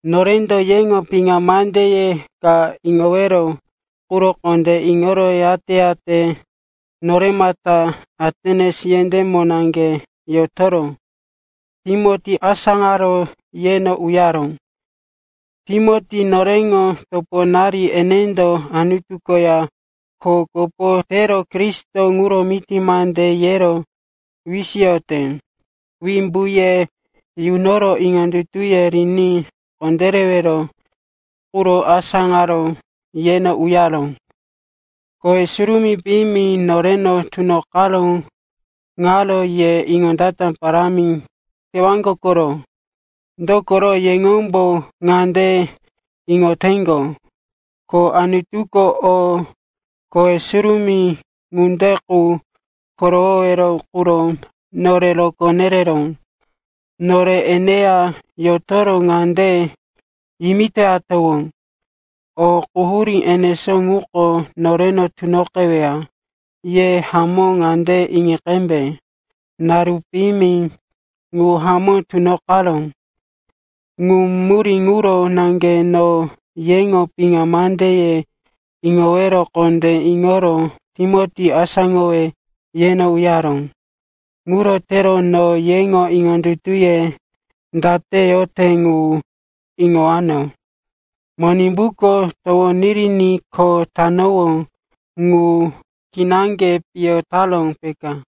Norendo yeŋo piŋa mandeye ka iŋowero quro kondé iŋoro, yate-yate noremata Atens yendémo naŋge yotoro Timoti asáŋaro yeno uyaró. Timoti noreŋo toponari, enendo Anutu koya kho kopo tero Kristo ŋuro miti mande yero wisiyote. Wimbu ye yunoro iŋondutuye riní kondérewero quro asáŋaro yeno uyaró. Kowe surumí piyimi noreno tunoqaró ŋaro ye iŋondata parámi tewaŋgo koro. Dokoro yeŋombo ŋande iŋoteŋgo, ko Anutuko o kowe surumí ŋunde qu korowowero quro nore rokó nereró. Nore yeya yotoro ŋande yimitoyatowó, o quhurí enesó ŋuko noreno tunoqeweya. Ye hamó ŋande iŋi qembe, naru piyimi ŋu hamó tunoqaró. Ŋu murí ŋuro naŋge no yeŋo piŋa mandeye iŋowero kondé iŋoro Timoti asáŋowe yeno uyaró. Ŋuro tero no yeŋo iŋondutuye date yote ŋu iŋowano. Monimbuko towo yiriní kho tatowó ŋu kinaŋge piyo taró, peka.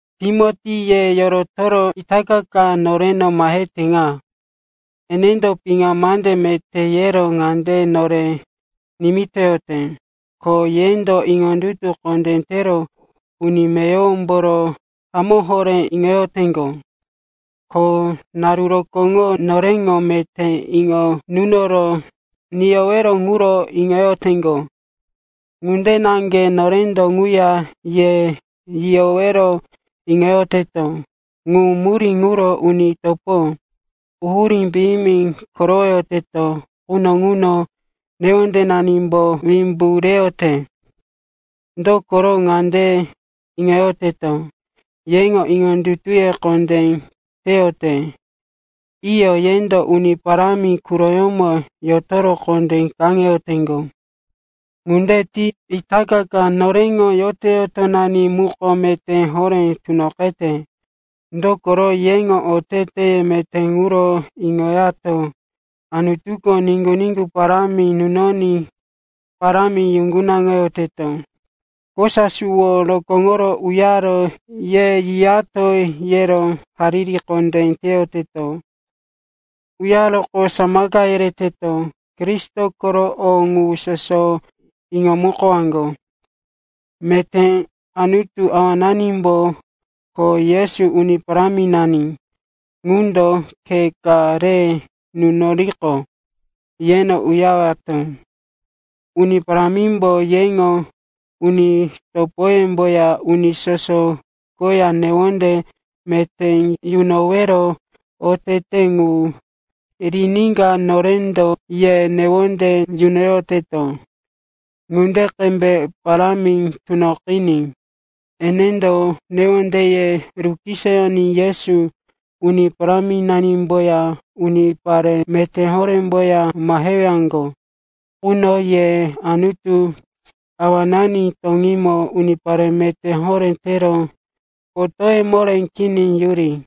Timoti ye yorotoro itaka ka noreno mahete ŋa. Enendo piŋa mande meté yero ŋande nore nimitoyote, ko yendo iŋondutu kondé tero uni meyowomboro hamó horé iŋoyoteŋgo. Ko naru rokóŋo noreŋo meté iŋo nunoro niyowero ŋuro iŋoyoteŋgo. Ŋunde naŋge norendo ŋuya ye yiyowero iŋoyoteto. Ŋu murí ŋuro, uni topo, quhurí piyimi korowoyoteto quno ŋuno newondenanimbo wimbu reyote. Dokoro ŋande iŋoyoteto, yeŋo iŋondutuye kondé teyote. Iyo, yendo Uni Parámi quroyómo yotoro kondé kaŋeyoteŋgo. Ŋunde ti itaka noreŋo yoto-yotonani muko meté horé tunoqete. Dokoro yeŋo oteteye meté ŋuro iŋoyato Anutuko niŋgu-niŋgu parámi nunoní parámi yuŋgunaŋoyoteto. Kosa suwo rokóŋoro uyaro ye yiyato yero hariri kondé teyoteto. Uyaroqo samaka yereto Kristo koro o ŋu soso iŋomukowaŋgo. Meté Anutu Awananimbo, ko Yesu, Uni Paráminani ŋundo, khe ka re nunoriqo, yeno uyarewato. Uni Parámimbo yeŋo uni topoyemboya uni soso koya newonde meté yunowero oteteye ŋu riníka norendo ye newonde yunoyoteto ŋunde qembe parámi tunoqiní. Enendo newondeye rukisoyoní Yesu, Uni Paráminanimboya unipare meté horéŋomboya mahewaŋgo quno ye Anutu Awanani toŋímo unipare meté horé tero, potóye moré kini yuri.